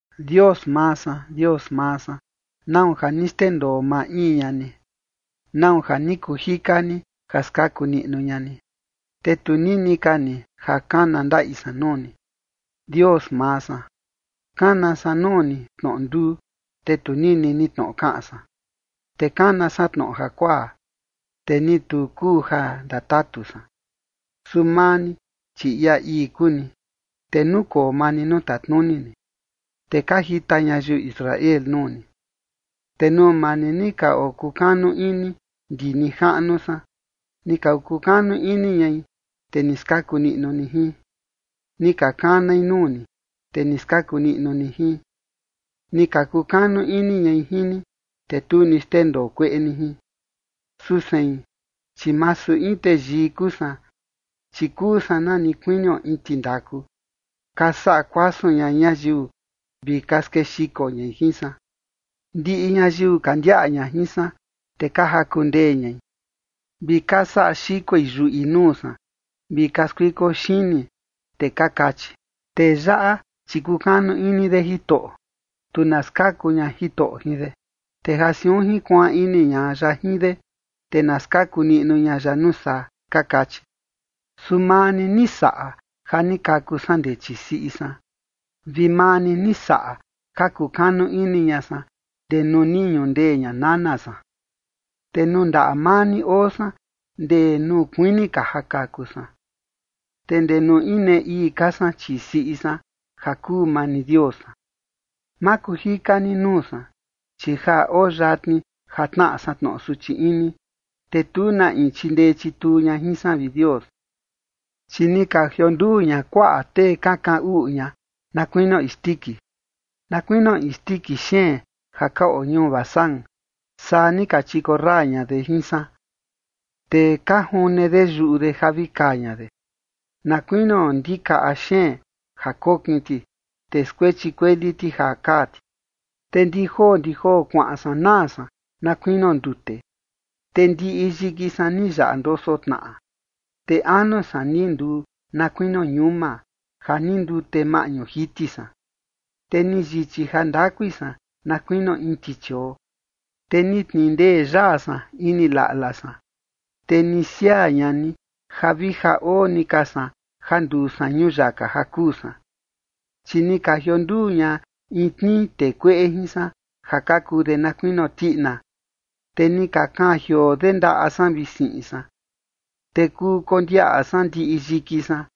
Dios maa san, Dios maa san, ¿nau ja ni xndendoo maa in ña ni? ¿Nau ja ni kuu jika ni ja skaku niꞌnu ña ni, te tu nini ka ni ja kana ndaꞌi san nuu ni? Dios maa san, kana san nuu ni tnoꞌo nduu, te tu nini ni tnoꞌo kaꞌan san, te kana san tnoꞌo jakuaa, te ni tu kuu ja ndatatu san. Su maa ni, chi ia ii kuu ni, te nukoo maa ni nuu tatnuni ni, te ka jita ñayiu Israel nuu ni. Te nuu maa ni, ni ka okukanu ini ndi nijaꞌnu san, ni ka kukanu ini ñai, te ni skaku niꞌnu ni jin. Ni ka kanai nuu ni, te ni skaku niꞌnu ni jin, ni ka kukanu ini ñai jin ni, te tu ni xndendoo kueꞌe ni jin. Su sein, chi masu in teyii kuu san, chi kuu san na ni kuinio in tindaku, ka saꞌa kuasun ña ñayiu vi ka skexiko ñai jin san. Ndiꞌi ñayiu ka ndiaꞌa ña jin san, te ka jaku ndee ñai, vi ka saꞌa xikoi yuꞌi nuu san vi ka skuiko xini, te ka kachi: “Tee yaꞌa, chi kukanu ini de Jitoꞌo, tu na skaku ña Jitoꞌo jin de, te ja siun jinkuaan ini ña ya jin de, te na skaku niꞌnu ña ya nuu saa”, ka kachi. Su maa ni, ni saꞌa ja ni kaku san ndee chii siꞌi san, vi maa ni ni saꞌa ja kukanu ini ña san ndee nuu ni ñundee ña nana san. Te nuu ndaꞌa maa ni oo san ndee nuu kuini ka ja kaku san, te ndee nuu inee ii ka san chii siꞌi san, ja kuu maa ni Dios san. Ma kuu jika ni nuu san, chi ja oo yatni ja tnaꞌa san tnoꞌo suchi ini, te tu na in chindee chituu ña jin san, vi Dios. Chi ni ka jionduu ña kuaꞌa tee ka kaꞌan uꞌu ña na kuinio isndiki, na kuinio isndiki xeen ja ka oo ñuu Basán, saa ni ka chikorra ña de jin san. Te ka june de yuꞌu de ja vi kaa ña de, na kuinio ndikaꞌa xeen ja kokin ti, te skuechi kueli ti ja kaa ti. Te ndi joo ndi joo kuaꞌan san naa san, na kuinio ndute. Te ndiꞌi yiki san ni yaꞌa ndoso tnaꞌa, te anu san ni nduu na kuinio ñuma, ja ni ndute maꞌñu jiti san. Te ni yichi jandakui san na kuinio in tichioo, te ni tnindee yaa san ini laꞌla san, te ni siaa ña ni ja vi ja oo ni ka san ja nduu san ñuyaka ja kuu san. Chi ni ka jionduu ña in tnii tee kueꞌe jin san ja ka kuu de na kuinio tiꞌina, te ni ka kaan jioo de ndaꞌa san vi siꞌin san. Te kuu kondiaꞌa san ndiꞌi yiki san,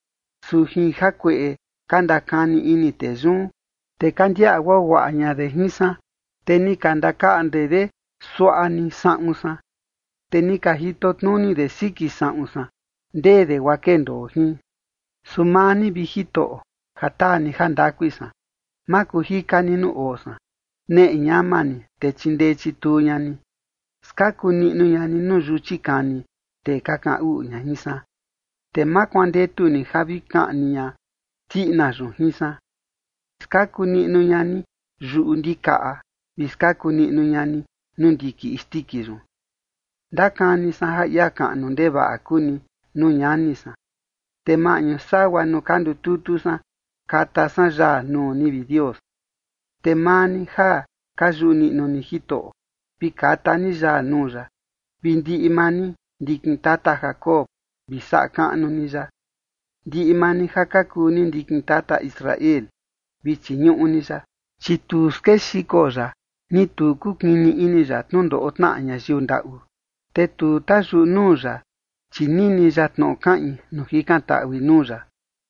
su jin jakueꞌe ka ndakani ini tee yun, te ka ndiaꞌa guaguaꞌa ña de jin san. Te ni ka ndakaꞌnde de suaꞌa ni saꞌun san, te ni ka jitotnuni de siki saꞌun san, ndee de guaa kendoo jin. Su maa ni, vi Jitoꞌo, ja taa ni jandakui san, ma kuu jika ni nuu oo san. Neꞌe ñama ni, te chindee chituu ña ni. Skaku niꞌnu ña ni nuu yuchi kani tee ka kaꞌan uꞌu ña jin san, te ma kuandetu ni ja vi kaꞌni ña tiꞌina yun jin san. Skaku niꞌnu ña ni yuꞌu ndikaꞌa vi skaku ña ni nuu ndiki isndiki yun. Ndakani san ja ia kaꞌnu ndevaꞌa kuu ni nuu ñani san, te maꞌñu sagua nuu ka ndututu san kata san yaa nuu ni, vi Dios. Te maa ni ja ka yuꞌu niꞌnu ni Jitoꞌo, vi kata ni yaa nuu ya, vi ndiꞌi maa ni, ndikin tata Jacob, vi saꞌa kaꞌnu ni ya, ndiꞌi maa ni ja ka kuu ni ndikin tata Israel, vi chiñuꞌu ni ya. Chi tu skexiko ya ni tu ni kukini ini ya tnundoꞌo tnaꞌa ñayiu ndaꞌu, te tu tayuꞌu nuu ya, chi nini ya tnoꞌo kaꞌin nuu jikantaꞌui nuu ya.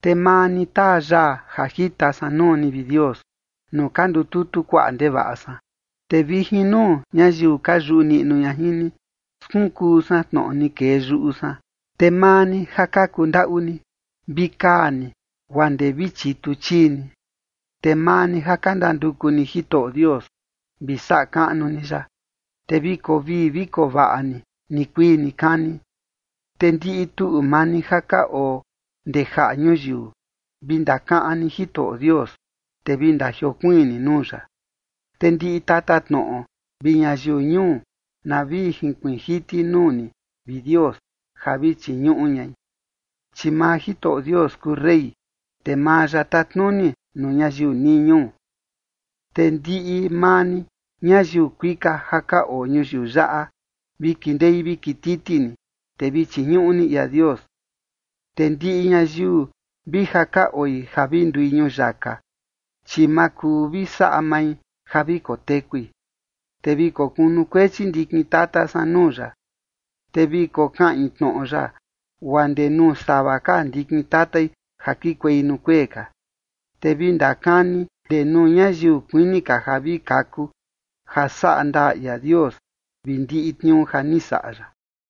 Te maa ni taa yaa ja jita san nuu ni, vi Dios, nuu ka ndututu kuaꞌa ndevaꞌa san, te vi jin nuu ñayiu ka yuꞌu niꞌnu ña jin ni, skunkuu san tnoꞌo ni kee yuꞌu san. Te maa ni ja ka kundaꞌu ni, vi kaa ni guaa ndee vi chitu chii ni, te maa ni ja ka ndanduku ni Jitoꞌo Dios, vi saꞌa kaꞌnu ni ya, te vi koo vii vi koo vaꞌa ni nikuii nikani. Te ndiꞌi tuꞌu maa ni ja ka oo ndee jaꞌa ñuyiu, vi ndakaꞌan ni Jitoꞌo Dios, te vi ndajiokuiin ni nuu ya. Te ndiꞌi tatatnoꞌo vi ñayiu ñuu, na vi jinkuiin jiti nuu ni, vi Dios, ja vi chiñuꞌu ñai. Chi maa Jitoꞌo Dios kuu rey, te maa ya tatnuni nuu ñayiu nii ñuu. Te ndiꞌi maa ni, ñayiu kuika ja ka oo ñuyiu yaꞌa, vi kindei vi kititi ni, te vi chiñuꞌu ni ia Dios. Te ndiꞌi ñayiu vi ja ka oi ja vi ndui ñuyaka, chi ma kuu vi saꞌa mai ja vi kotekui. Te vi kokunukuechi ndikin tata san nuu ya, te vi kokaꞌin tnoꞌo ya guaa ndee nuu sava ka ndikin tatai ja kikuei nuu kuee ka. Te vi ndakani ndee nuu ñayiu kuini ka ja vi kaku, ja saꞌa ndaa ia Dios vi ndiꞌi tniuu ja ni saꞌa ya.